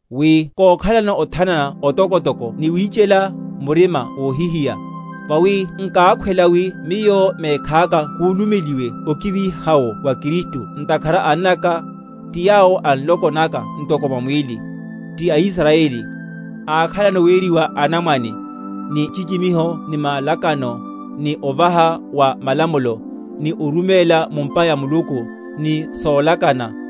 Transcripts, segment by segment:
wi kókhalano othanana otokotoko ni wichela murima wohihiya. Vawi nkákhwela wi miyo mekhaka kúlumeliwe okiviha’wo wa Kristu ntakhara a annaka, ti yawo a nloko naka ntoko mwa mwíli; ti aIsrayeli; ákhalano weriwa anamwane, ni nchichimiho ni malakano, ni ovaha wa malamulo, ni oruméla mu’mpa ya Muluku, ni solakana;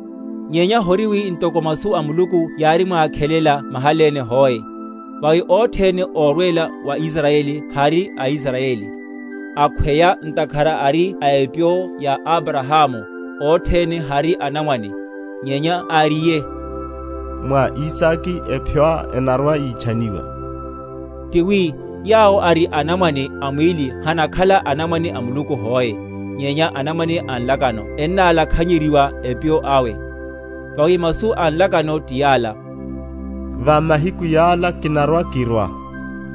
Nyenya hori wi ntoko masu a Muluku yárimwikhalela mahaléne hoe. Vawi othene órwela wa Israyeli hari Israyeli; akhweya ntakhara ari epyo ya Abrahamu, othene hari anamwane; nyenya, áriye, Mwa Isake apyoá enarwa‐yitchaniwa. Ti wi, yawo ari anamwane a mwíli hanakhala anamwane a Muluku hoe; nyenya anamwane a nlakano ennálakhanyeryiwa epyo awe. Vawi masu a nlakano ti yala, Va mahiku yala kinarwa‐kirwa,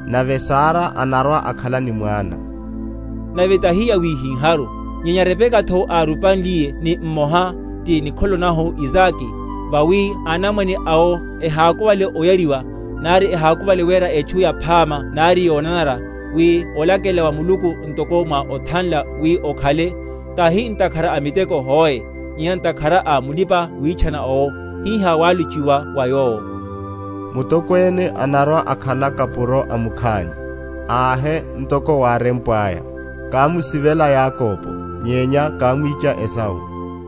Nave Sara anarwa‐akhala ni mwana. Nave tahi yawihiháru, nyenya Rebekatho, árupanliye ni mmoha, ti nikholo nahu Isake; vawi anamwane awo ehákuvale oyariwa, nari ehákuvale wera etchu yaphama nari yonanara, wi olakelela wa Muluku ntoko mwa othanla wi okhale, tahi ntakhara a miteko hoe, nyenya ntakhara a mulipa‐witchana owo, hihá wálochiwa wa yowo, Mutokwene anarwa‐akhala kapuro a mukhani. Ahe ntoko wárempwaya, Kámusivela Yakobo, nyenya kámwicha Esau.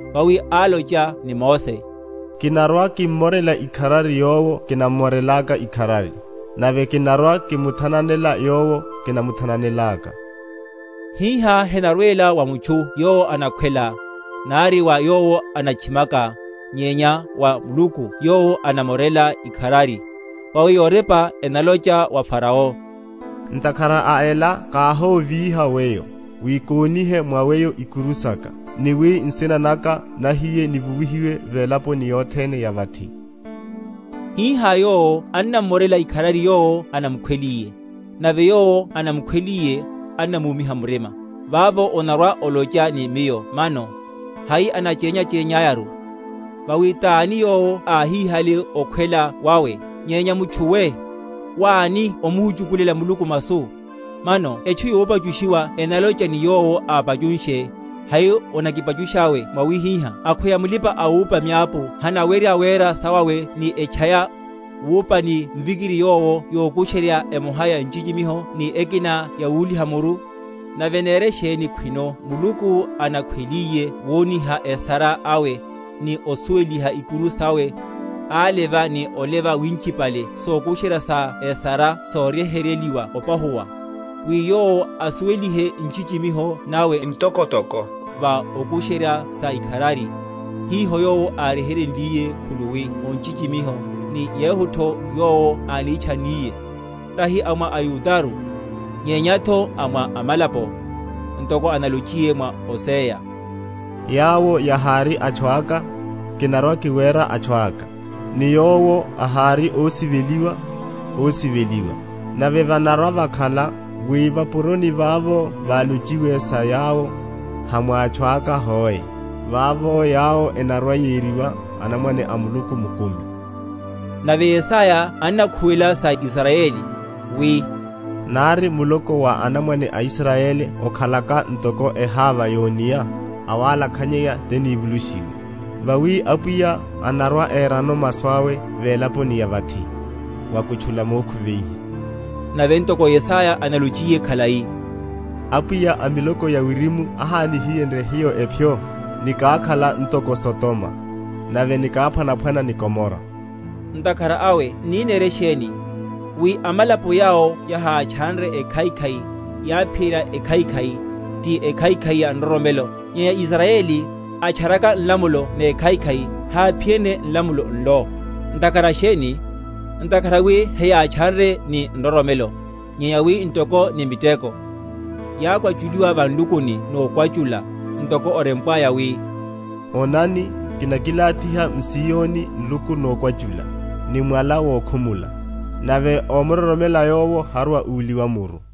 Vawi álocha ni Mose, Kinarwa‐kimmorela ikharari yowo kinnamorelaka ikharari, Nave kinarwa‐kimuthananela yowo kinamuthan?-?anelaka. Hiha henarwela wa mutchu yowo anakhwela, nari wa yowo anatchimaka, nyenya wa Muluku yowo anamorela ikharari. Vawi yorepa enalocha wa Farao, Ntakhara a ela káhóvíha weyo, Wi konihe mwa weyo ikuru saka, Ni wi nsina naka nahiye nivuwihiwe velaponi yothene ya vathi. Hihá Yowo annamorela ikharari yowo anamukhweliye, nave yowo anamukhweliye annamúmiha murima. Vavo onarwa‐olocha ni miyo mano, Hai anachenyachenyiyeru? Vawi tani yowo áhíhale okhwela wawe? Nyenya mutchu we, wáni ómuhuchukulela Muluku masu? Mano etchu yopachushiwa enalocha ni yowo ápachunshe, Hai onakipachushá mwawihihá? Akhweya mulipa‐awupa miapu hanawerya wera sawawe ni etchaya, wupa ni mvikiri yowo yokusherya emoha ya nchichimiho ni ekina yawúliha muru? Nave nere sheni khwino Muluku, anakhweliye woniha esara awe, ni osuweliha ikuru sawe, áleva ni oleva winchipale sokusherya sa esara soryeheryeliwa opahuwa? Wi Yowo asuwelihe nchichimiho nawe ntokotoko va sokusherya sa ikharari, hiho Yowo áryeheryenliye khuluwi o nchichimiho, ni yehutho Yowo ánitchanniye, tahi a mwa aYudaru, nyenyatho a mwa amalapo? Ntoko analochiyetho mwa Hosea, Yawo yahári atchu aka, kinarwa‐kiwera atchu aka; Ni yowo ahári ósiveliwa, ósiveliwa. Nave vanarwa‐vakhala, wi va’puroni vavo válochiwe sa yawo, Ha mwa atchu aka hoe, Vavo yawo enarwa‐yeriwa, anamwane a Muluku mukumi, Nave Yesaya annakhuwela sa Israyeli, wi, Nari muloko wa anamwane aIsrayeli okhalaka ntoko eháva yónia, awalakhanyeya tini?-?vulushiwe. Vawi Apwiya anarwa‐erano masu awe velaponi ya vathi, wakutchula mokhuveiha. Nave ntoko Yesaya álonchiye khalai, Apwiya a miloko ya wirimu ahánihiyenrye hiyo epyo, Nikákhala ntoko Sodoma, nave nikáphwanaphwana ni Gomora. Ntakhara awe n’ni nere sheni? Wi amalapo yawo yahátchanre ekhaikhai, yáphiyerya ekhaikhai, ti ekhaikhai ya nroromelo; nyenya Israyeli, atcharaka nlamulo nekhaikhai, háphiyenrye nlamulo nlo. Ntakhara sheni? Ntakhara wi heyátchanre ni nroromelo, nyenya wi ntoko ni miteko. Yákwachuliwa va nlukuni nokwachula; ntoko orempwaya, wi, Onani, kinakilathiha m’Ziyoni nluku nokwachula, ni mwala wokhumula; Nave ómuroromela Yowo harwa‐uliwa muru.